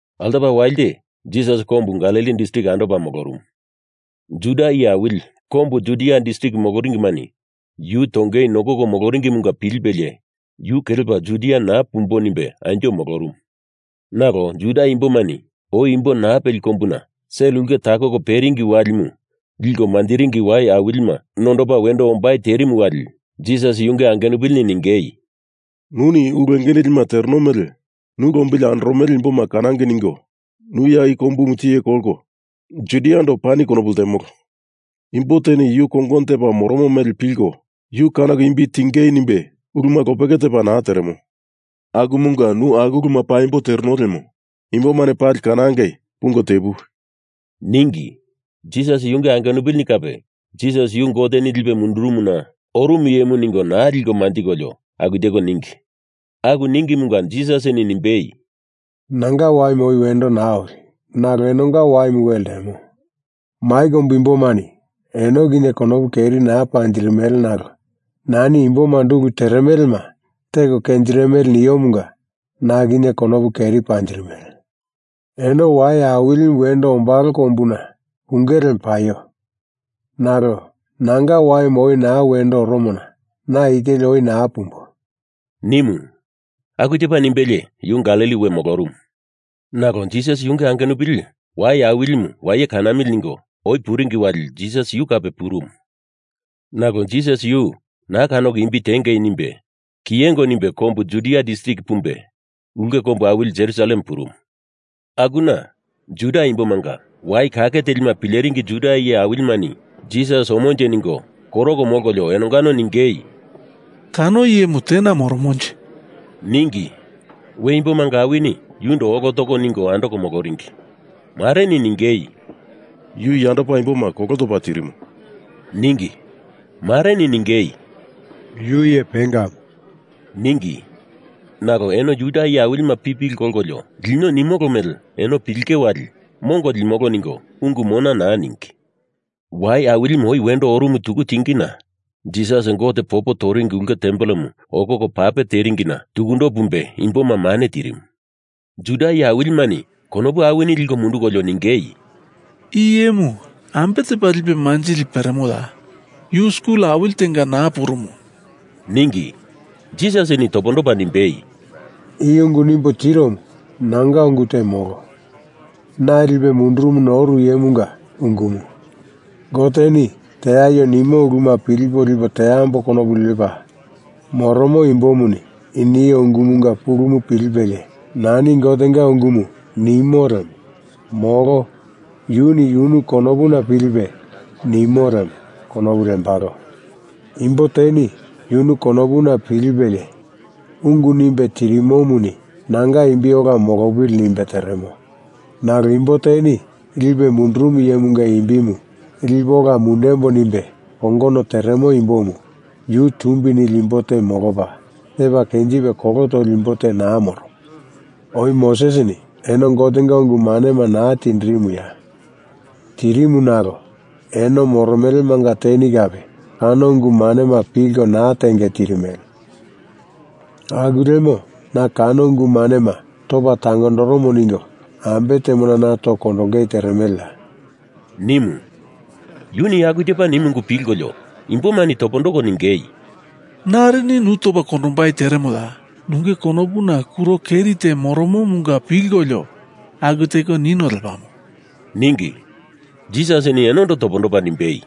Altopa walite Jisas kombu Galili distrik andopa molorumu. Juda iye awili kombu Judia distrik moloringimani yu tongei nokoko moloringimunga pilipelie yu kelepa Judia naa pumbo nimbe anjo molorumu. Nalo Juda imbomani oi imbo naa peli kombuna sel ulke takoko peringi walimu liko manjiringi wai awilima nondopa wendo ombai terimu wali Jisas yunge angenupilini ningei, “Nuni ulu enge nilima tereno mele nu lombili andoromele imboma kanangei ningo nu ya i kombu tiye kolko Judiando pani konopu ltemolo. Imbo teni yu kongono tepa moromo mele pilko yu kanoko imbi tiengei nimbe uluma lopeke tepa naa teremo. Akumunga nu aku uluma paimbo tereno lemo imbomani pali kanangei pungo tepuwi!” ningi. Jisas yunge angenupilini kape Jisas yu Goteni lipe mundurumuna orumu iyemu ningo naa liko manjikolio aku teko ningi. Aku ningimunga Jisasini nimbei, “Nanga waimu oi wendo naa oli. Nalo enonga waimu we ltemo. Mai kombu imbomani eno kinye konopu keri naa panjirimele nalo nani imbomando ulu teremelema teko kenjirimele niomunga na kinye konopu keri panjirimele. Eno Wai Awilimu wendo ombalo kombuna punge lemo paio! Nalo nanga waimu oi naa wendo oromona na i teli oi naa pumbo,” nimu. Aku tepa nimbelie yu Galili we molorumu. Nalo Jisas yunge angenupili Wai Awilimu waye kanamili ningo oi puringi wali Jisas kape purumu. Nalo Jisas yu naa kanoko imbi tiengei nimbe kiyengo nimbe kombu Judia distrik pumbe ulke kombu awili Jerusalem purumu. Akuna Juda imbomanga wai kake telima pileringi Juda iye awilimani Jisas omonje ningo koroko molkolio enongano ningei, “Kano iyemu tena moromonje?” ningi. We imbomanga awini yundo olo toko ningo andoko moloringi. Mareni ningei, “Yu yandopa imboma kolo topa tirimo,” ningi. Mareni ningei, “Yu iye pengamu,” ningi. Nalo eno Juda iye awilima pipili kolkolio lino nimolo mele eno pilinge wali mongo limolo ningo ungu mona naa ningi. Wai Awilima oi wendo orumu tuku tingina Jisas Gote popo toringi ulke tempelemu okoko pape teringina tukundo pumbe imboma mane tirimu. Juda iye awilimani konopu awini liko mundukolio ningei, “I iyemu ambe tepa lipe manjili peremoya? Yu skul awili tenga naa purumu,” ningi. Jisasini topondopa nimbei, “I ungu nimbo tiromu nanga ungu te molo. Na lipe mundurumuna oru iyemunga ungumu. Goteni teaio nimo uluma pilipo lipo teambo konopu lepa moromo imbomuni i nio ungumunga pulumu pilipelie, nani Gotenga ungumu nimo lemo molo yuni yunu konopuna pilipe nimo lemo konopu lembalo. Imbo teni yunu konopuna pilipelie ungu nimbe tirimomuni nanga imbi ola molopili nimbe teremo, nalo imbo teni lipe mundurumu iyemunga imbimu lipo ola mundembo nimbe kongono teremo imbomu yu tumbi nili imbo te molopa, tepa kenjipe kolo toli imbo te naa moromo. Oi Mosesini eno Gotenga ungu manema naa tindirimuya? Tirimu nalo eno moromelemanga teni kape kano ungu manema pilko naa tenge tirimele. Aku lemo na kano ungu manema topa tangondoromo ningo ambe temona na toko kondongei teremeleya?” nimu. Yuni aku tepa nimu ungu pilkolio imbomani topondoko ningei, “Narini nu topa kondombai teremoya? Nunge konopuna kuro keri te moromomunga pilkolio aku teko nino lepamo,” ningi. Jisasini enondo topondopa nimbei,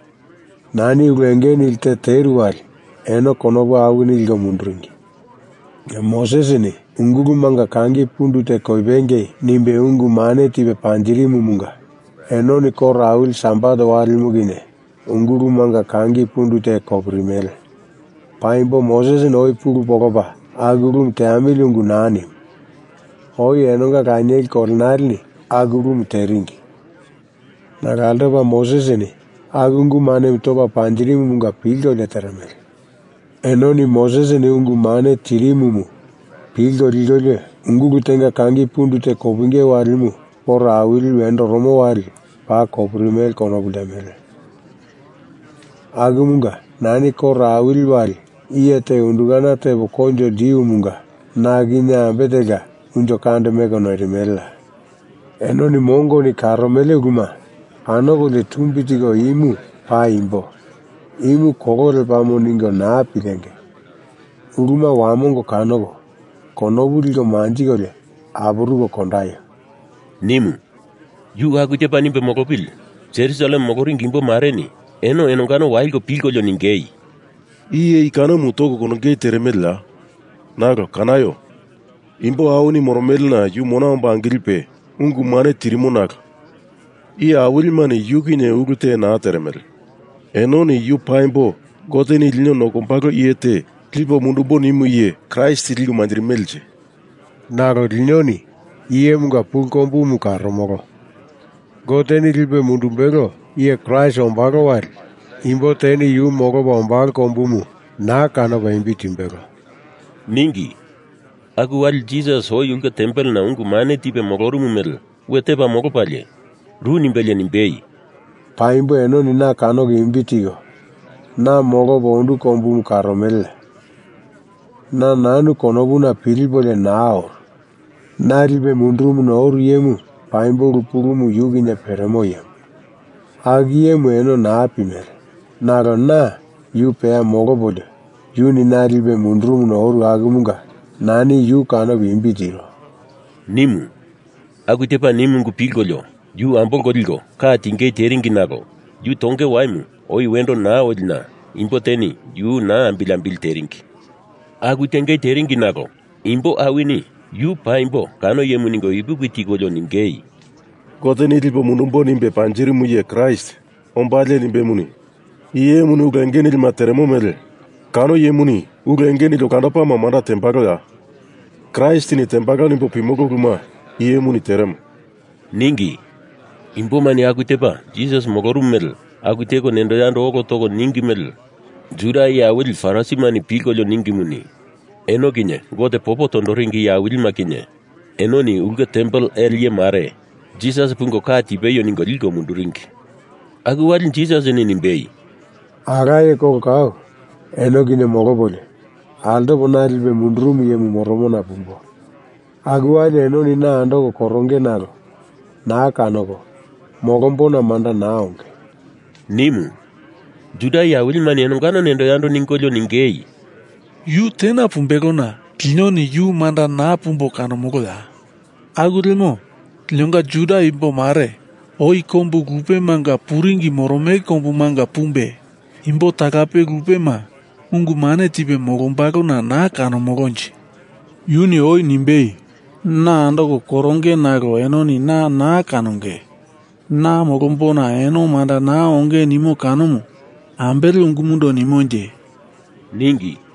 “Nani ulu enge nili te teru wali eno konopu awini liko munduringi. Mosesini ungulumanga kangi pundu te kopingei nimbe ungu mane tipe panjirimumunga enoni koro awili Sabat walimu kinye ungulumanga kangi pundu te kopirimele. Paimbo Mosesini oi pulu polopa aku ulumu teamili ungu naa nimu. Oi enonga lanieli kolenaleni aku ulumu teringi, nalo altopa Mosesini aku ungu manemu topa panjirimumunga pilkolio teremele. Enoni Mosesini ungu mane tirimumu pilko likolio ungulu tenga kangi pundu te kopinge walimu koro awili wendo oromo wali paa kopirimele konopu ltemele. Akumunga nani koro awili wali iye te undukana tepo koinjo ltiumunga na kinye ambe telka unjo kande meko noirimeleya? Enoni mongoni karomele uluma kanokolio tumbi tiko imu paimbo, imu kolo lepamo ningo naa pilengei! Uluma wamongo kanoko konopu liko manjikolio apuruko kondaio!” nimu. Yu aku tepa nimbe molopili Jerusalem moloringi imbo mareni eno enongano waliko pilkolio ningei, “Iye i kanomu toko kondongei teremeleya? Nalo kanaio! Imbo awini moromelena yu mona omba angilipe ungu mane tirimo nalo iye awilimani yu kinye ulu te naa teremele. Enoni yu paimbo Goteni lino nokombalo iye te lipo mundumbo nimu iye Kraist liko manjirimelenje? Nalo linoni i iyemunga pulu kombumu karomolo. Goteni lipe mundumbelo iye Kraist ombalo wali imbo teni yu molopa ombalo kombumu naa kanopa imbi timbelo,” ningi. Aku wali Jisas, oi ulke tempelena ungu mane tipe molorumu mele we tepa molopalie, ru nimbelie nimbei, “Paimbo enoni na kanoko imbi tiko, na molopo ondu kombumu karomeleya? Na nanu konopuna pilipolio naa oru. Na lipe mundurumuna oru iyemu paimbo ulu pulumu yu kinye peremo iyemu. Aku iyemu eno naa pimele nalo na yu peya molopolio, yuni na lipe mundurumuna oru akumunga nani yu kanopo imbi tiro,” nimu. Aku tepa nimu ungu pilkolio yu ambolko liko ka tingei teringi nalo yu tonge waimu oi wendo naa olina imbo teni yu naa ambili ambili teringi. Aku tengei teringi nalo imbo awini yu paimbo kano iyemu ningo ipuki tikolio ningei, “Goteni lipo mundumbo nimbe panjirimu iye Kraist ombalie nimbemuni, i iyemuni ulu enge nilima teremo mele kano iyemuni ulu enge nili olandopama manda tembaloya? Kraistini tembalo nimbo pimolo uluma i iyemuni teremo,” ningi. Imbomani aku tepa Jisas molorumu mele aku teko nendo yando olo toko ningi mele Juda iye awili Farisimani pilkolio ningimuni, eno kinye Gote popo tondoringi iye awilima kinye enoni ulke tempel ele iye mare Jisas pungo ka tipeio ningo liko munduringi. Aku wali Jisasini nimbei, “Alaye kolo kau eno kinye molopolio, altopa na lipe mundurumu iyemu moromona pumbo. Aku wali enoni na andoko koronge nalo naa kanoko, molombona manda naa onge,” nimu. Juda iye awilimani enongano nendo yando ningolio ningei, “Yu tena pumbelona linoni yu manda naa pumbo kanomoloya? Aku lemo linonga Juda imbo mare oi kombu lupemanga puringi moromele kombumanga pumbe imbo talape lupema ungu mane tipe molombalona naa kanomolonje? Yuni oi nimbei, na andoko koronge nalo enoni na naa kanonge, na molombona eno manda naa onge nimo kanomu ambele ungumundo nimonje?” ningi.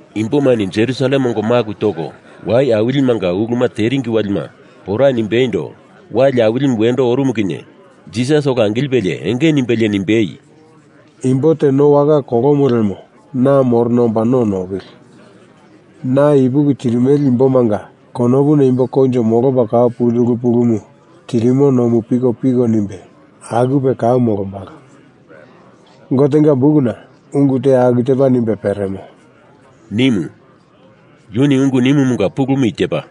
Imboma Jerusalem ongo maku toko Wai Awilimanga uluma teringi walima pora nimbeindo wali awilimu wendo orumu kinye Jisas ola angilipelie enge nimbelie nimbei, “Imbo te no waka kolomo lemo na morona omba no nopili! Na ipuki tirimele imbomanga konopuna imbo koinjo molopa kau puli ulu pulumu tirimo nomu pikopiko nimbe akupe aku molombalo. Gotenga bukuna ungu te aku tepa nimbe peremo,” nimu. Yuni ungu nimumunga pulumu i tepa: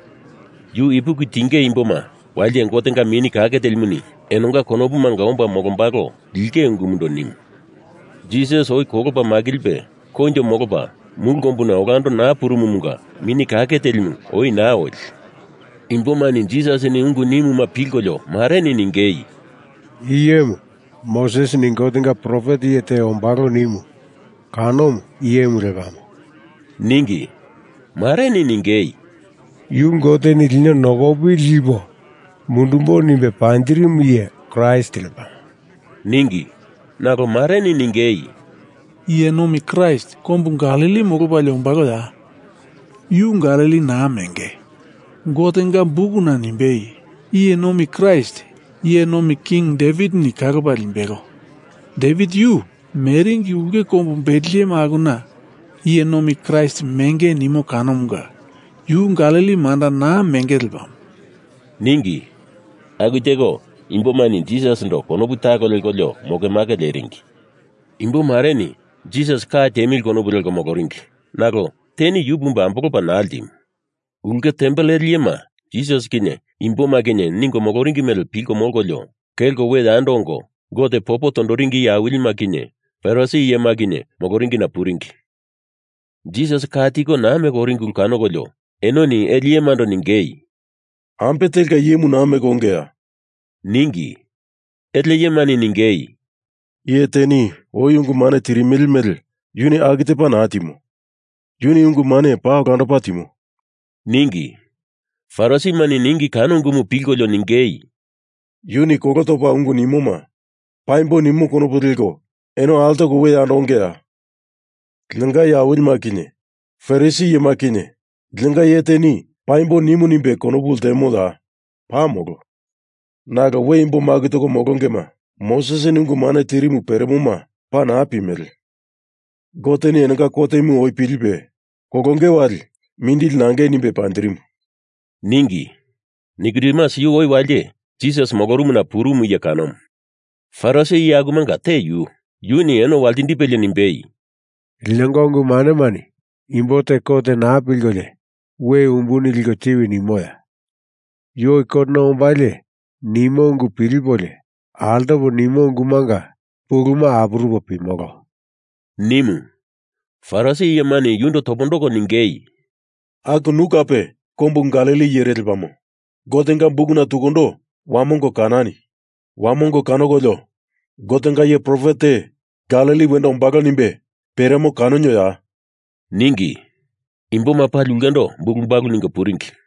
Yu ipuki tinge imboma walite Gotenga Mini Kake Telimu enonga konopumanga omba molombalo lingei ungundo nimu. Jisas oi kolopa makilipe koinjo molopa mulu kombuna olando naa purumumunga Mini Kake Telimu oi naa oli. Imbomani Jisasini ungu nimuma pilkolio mareni ningei, “I iyemu Mosesini Gotenga profet iye te ombalo nimu kanomu, i iyemu lepamo,” ningi. Mareni ningei, “Yu Goteni lino nokopili lipo mundumbo nimbe panjirimu iye Kraist lepamo,” ningi. Nalo mareni ningei, “Iye Nomi Kraist kombu Galili molopalie ombaloya? Yu Galili naa menge. Gotenga Bukumuni nimbei, Iye Nomi Kraist iye nomi king Devitini kalopa limbelo. Devit yu meringi ulke kombu Betlehem akuna Iye Nomi Kraist menge nimo kanomunga yu Galili manda naa menge lepamo,” ningi. Aku teko imbomani Jisasindo konopu talo lekolio mokemake leringi. Imbo mareni Jisas ka tiemili konopu leko moloringi nalo teni yu pumbe ambolopa naa ltimu. Ulke tempel ele iyema Jisas kinye imboma kinye ningo moloringi mele pilko molkolio, kelko we yando ongo Gote popo tondoringi iye awilima kinye Farisi iyema kinye moloringina puringi. Jisas ka tiko naa meko oringi ulu kanokolio enoni ele iyemando ningei, “Ambe telka iyemu naa meko ongeya?” ningi. Ele iyemani ningei, “Iye teni oi ungu mane tirimele mele yuni aku tepa naa timo. Yuni ungu mane paa olandopa timo,” ningi. Farisimani ningi kano ungumu pilkolio ningei, “Yuni kolo topa ungu nimoma paimbo nimo konopu leko eno altoko we yando ongeya? Linonga iye awilima kinye Farisi iyema kinye linonga iye teni paimbo nimu nimbe konopu ltemoya? Paa molo. Nalo we imbo maku toko molongema Mosesini ungu mane tirimu peremoma paa naa pimele. Goteni enonga kotemu oi pilipe, kolonge wali mindili nangei nimbe panjirimu,” ningi. Nikodemus yu oi walite Jisas molorumuna purumu iye kanomu, Farisi iye akumanga te yu, yuni eno waltindipelie nimbei, “Linonga ungu manemani imbo te kot naa pilkolio we umbuni liko tiwi nimoya? Yu oi kotena ombalie nimo ungu pilipolio altopa nimo ungumanga puluma apurupo pimolo,” nimu. Farisi iyemani yundo topondoko ningei, “Aku nu kape kombu Galili iyere lepamo? Gotenga bukuna tukundo wamongo kanani! Wamongo kanokolio Gotenga iye profet te Galili wendo ombalo nimbe peremo kanonioya?” ningi. Imboma pali ulkendo bulu balu ningo puringi.